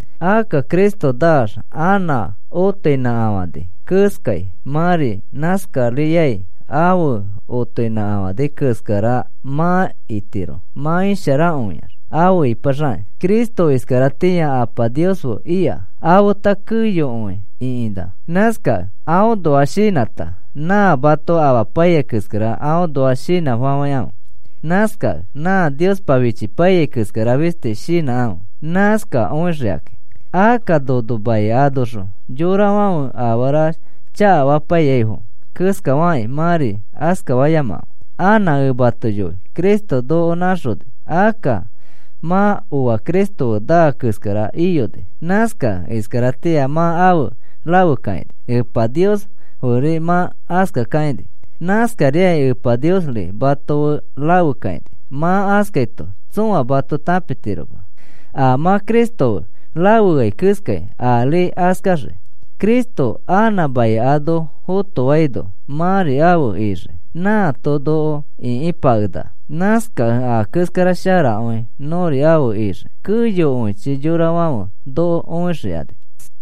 Akka Cristo naax anã otoinãkafani keskai mãri nãskariai afe otoinãkafani keskara mã itiro mã isharakõiax afe ipaxakĩ. Cristo iskaratĩa Apa Nios fe ika afeta keyokõi ĩkinã. Nãskakẽ aõnoa shinãta nã mato amapaiyai keskara aõnoa shinãfafãikãfe. Nãskakẽ nã Niospa fichipaiyai keskara fisti shinãkãfe, nãskakõixikakĩ. Akka nono mai anoxõ yorafãfe afara chakafapaiyaifo keskafakĩ mãri askafayamakãfe. Anã ẽ mato yoi Cristo noko nãxoni. Akka mã oa Cristo fe naa keskara iyoni, nãskakẽ iskaratĩa mã afe rafekakaini, Epa Nios feri mã askakakãini. Nãskariai Epa Niosri mato fe rafekakaini. Mã askaito tsõa mato tãpitiroma, a mã Cristo fe rafeai keskai ari askaxiki. Cristo anã mai ano fotofaino mãri afe ixii. Nãato noko ĩkipakenaka. Nãskakẽ a keskara sharakõi nõri afe ixii, keyokõichi yorafãfe noko õixikani.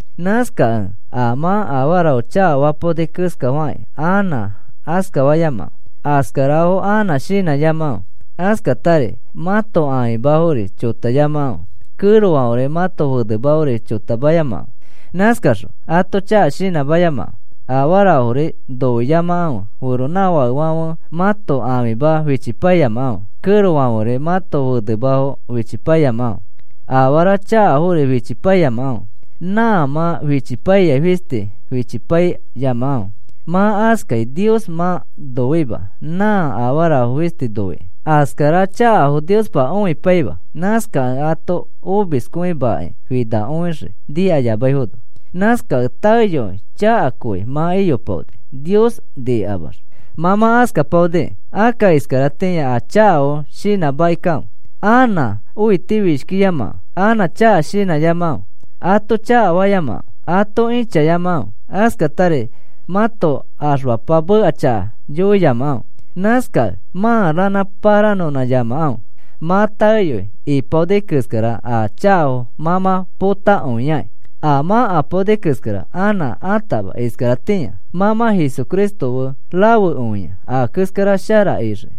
Nãskakẽ a mã afarafo chakafapaoni keskafakĩ anã askafayamakãfe. Askarafo anã shinãyamakãfe. Askatari mãto ãfimafori chotayamakãfe, kẽrofãferi mãto fenemafori chotamayamakãfe. Nãskaxõ ato chaka shinãmayamakãfe. Afarafori noiyamakãfe feronãfakefãfe mãto ãfima fichipaiyamakãfe, kẽrofãferi mãto fenemafo fichipaiyamakãfe. Afara chakafori fichipaiyamakãfe, nã mã fichipaiyai fisti fichipaiyamakãfe. Mã askakĩ Nios mã noima, nã afarafo fisti noikĩ. Askara chakafo Niospa õipaima, nãskakẽ ato omiskõimakĩ finakõixii nikayamaifono. Nãskakẽ taeyoi chakakõi mã iyopaoni Nios nikamax. Mã mã askapaoniki. Akka iskaratĩa a chakafo shinãmakikãfe. Anã õitifishkiyamakãfe, anã chaka shinãyamakãfe, ato chakafayamakãfe, ato ĩchayamakãfe, askatari mãto axfapa meka chaka yoiyamakãfe. Nãskakẽ mã ranã pãranõnãyamakãfe, mã taeyoi ipaoni keskara a chakafo mã mã potakõiakĩ. A mã apaoni keskara anã atama iskaratĩa, mã mã Jesucristo fe rafekõia a keskara shara ixiki.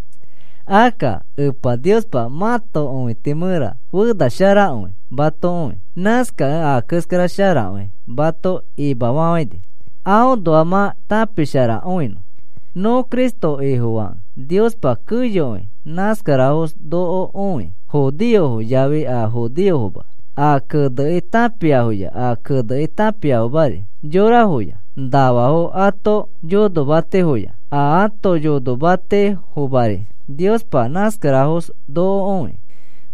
Akka Epa Niospa mãto õiti mẽra fena sharakõi mato õi. Nãskakẽ a keskara sharakõi mato imafafãini, aõnoa mã tãpisharakõinõ. Nõ Cristo Ifofakẽ Niospa keyokõi nãskarafos noko õi. Judeofo yafi a judeofoma, a kene tãpiafoya a kene tãpiafomari, yorafoya nafafo ãto yonomatifoya a ãto yonomatifomari Niospa nãskarafos noko õi.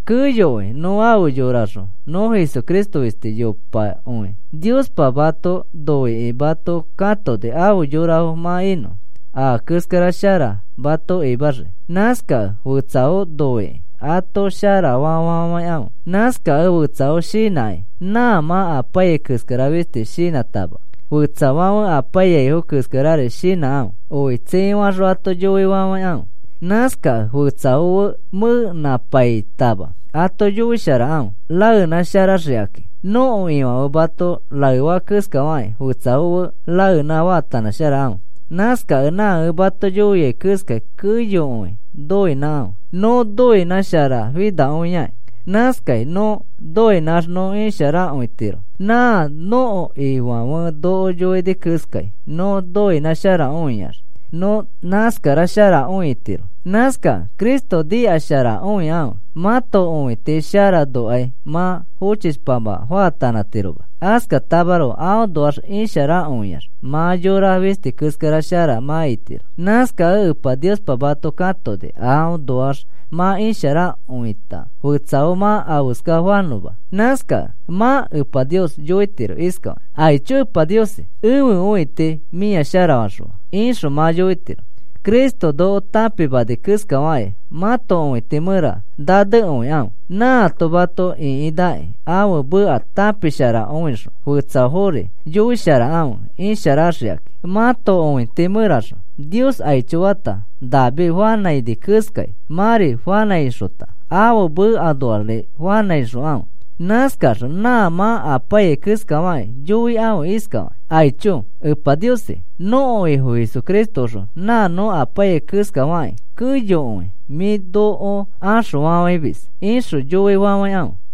Keyokõi nõ afe yoraxõ nõ Jesucristo fisti yopakõi. Niospa mato noikĩ mato katoni afe yorafo mã inõ. Aa keskara shara mato imaxiki. Nãskakẽ fetsafo noikĩ ato sharafa fafafãikãfe. Nãskakẽ fetsafo shinãki nã mã apaiyai keskara fisti shinãtama, fetsafãfe apaiyaifo keskarari shinãkãfe, oi tsii faxõ ato yoifafãikãfe. Nãskakẽ fetsafo fe mẽnãpaitama ato yoisharakãfe raenãsharaxikãki. Nõko Ifãfe mato raefa keskafakĩ fetsafo fe raenã faatanãsharakãfe. Nãskakẽ nã ẽ mato yoiai keskai, keyokõi noinãkãfe, nõ noinãsharafinakõiaki. Nãskai nõ noinãx nõ isharakõitiro, nã nõko Ifãfe noko yoini keskai nõ noinãsharakõiax nõ nãskasharakõitiro. Nãskakẽ Cristo nikasharakõikãfe mãto õiti sharanokai mã fochishpanã faatanãtiroma. Askatamaroko aõnoax isharakõiax nã yora fisti keskara shara mã itiro. Nãskakẽ Epa Niospa mato katoni aõnoax mã isharakõita fetsafo mã afeska fanõma. Nãskakẽ mã Epa Nios yoitiro iskafakĩ: “Aicho Epa Niosi, ẽfe õiti mĩa sharafaxõa,” ixõ mã yoitiro. Cristo noko tãpimani keskafakĩ mãto õiti mẽra nanekõikãfe. Nãato mato ĩkinãkĩ ãfe meka tãpisharakõixõ fetsafori yoisharakãfe isharaxikakĩ. Mãto õiti mẽraxõ Nios aicho fata David fanãini keskai mãri fanãixota ãfe mekaõnoari fanãixokãfe. Nãskaxõ nã mã apaiyai keskafakĩ yoikãfe iskafakĩ: “Aicho, Epa Niosi. Nõko Ifo Jesucristoõxõ nã nõ apaiyai keskafakĩ keyokõi mĩ noko axõfafãimis,” ixõ yoifafãikãfe.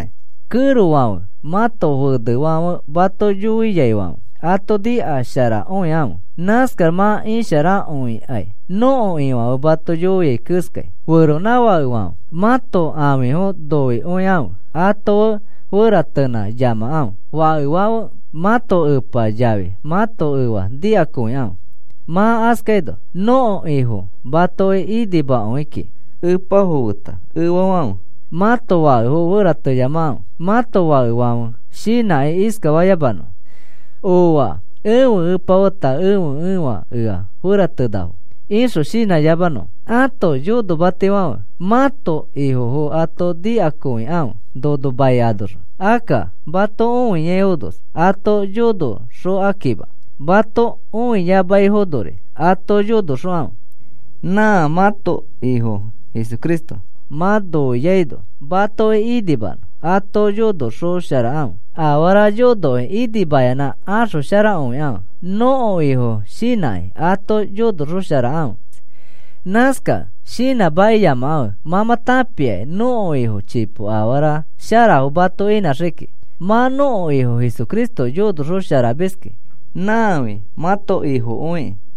Kẽrofãfe, mãto fenefãfe mato yoiaifãfe ato nikasharakõikãfe. Nãskax mã isharakõikai nõko Ifãfe mato yoiai keskai. Feronãfakefãfe, mãto ãfifo noikõikãfe ato fe feratenãyamakãfe. Fakefãfe, mãto epa yafi mãto efa nikakõikãfe. Mã askaino nõko Ifo matoki inimakõi kiki. Epafo feta efafãfe, mãto fakefo ferateyamakãfe, mãto fakefãfe shinãkĩ iskafayamanõfo: “Ooa, ẽfe epa feta ẽfe efa ea feratenafo,” ixõ shinãyamanõfo. Ãto yonomatifãfe, mãto ifofo ato nikakõikãfe nono mai anoxõ. Akka mato õiaifonos ato yonoxokakĩma, mato õiamaifonori ato yonoxokãfe. Nã mãto Ifo Jesucristo mã noiaino, matoki inimanõ ato yonoxosharakãfe. Afara yonokĩ inimayanã axosharakõikãfe. Nõko Ifo shinãkĩ ato yonoxosharakãfe. Nãskakẽ shinãmakiyamakãfe mã mã tãpiaki nõko Ifo chipo afara sharafo mato inãxii kiki. Mã nõko Ifo Jesucristo yonoxosharamiski, nãfi mãto Ifokõikĩ.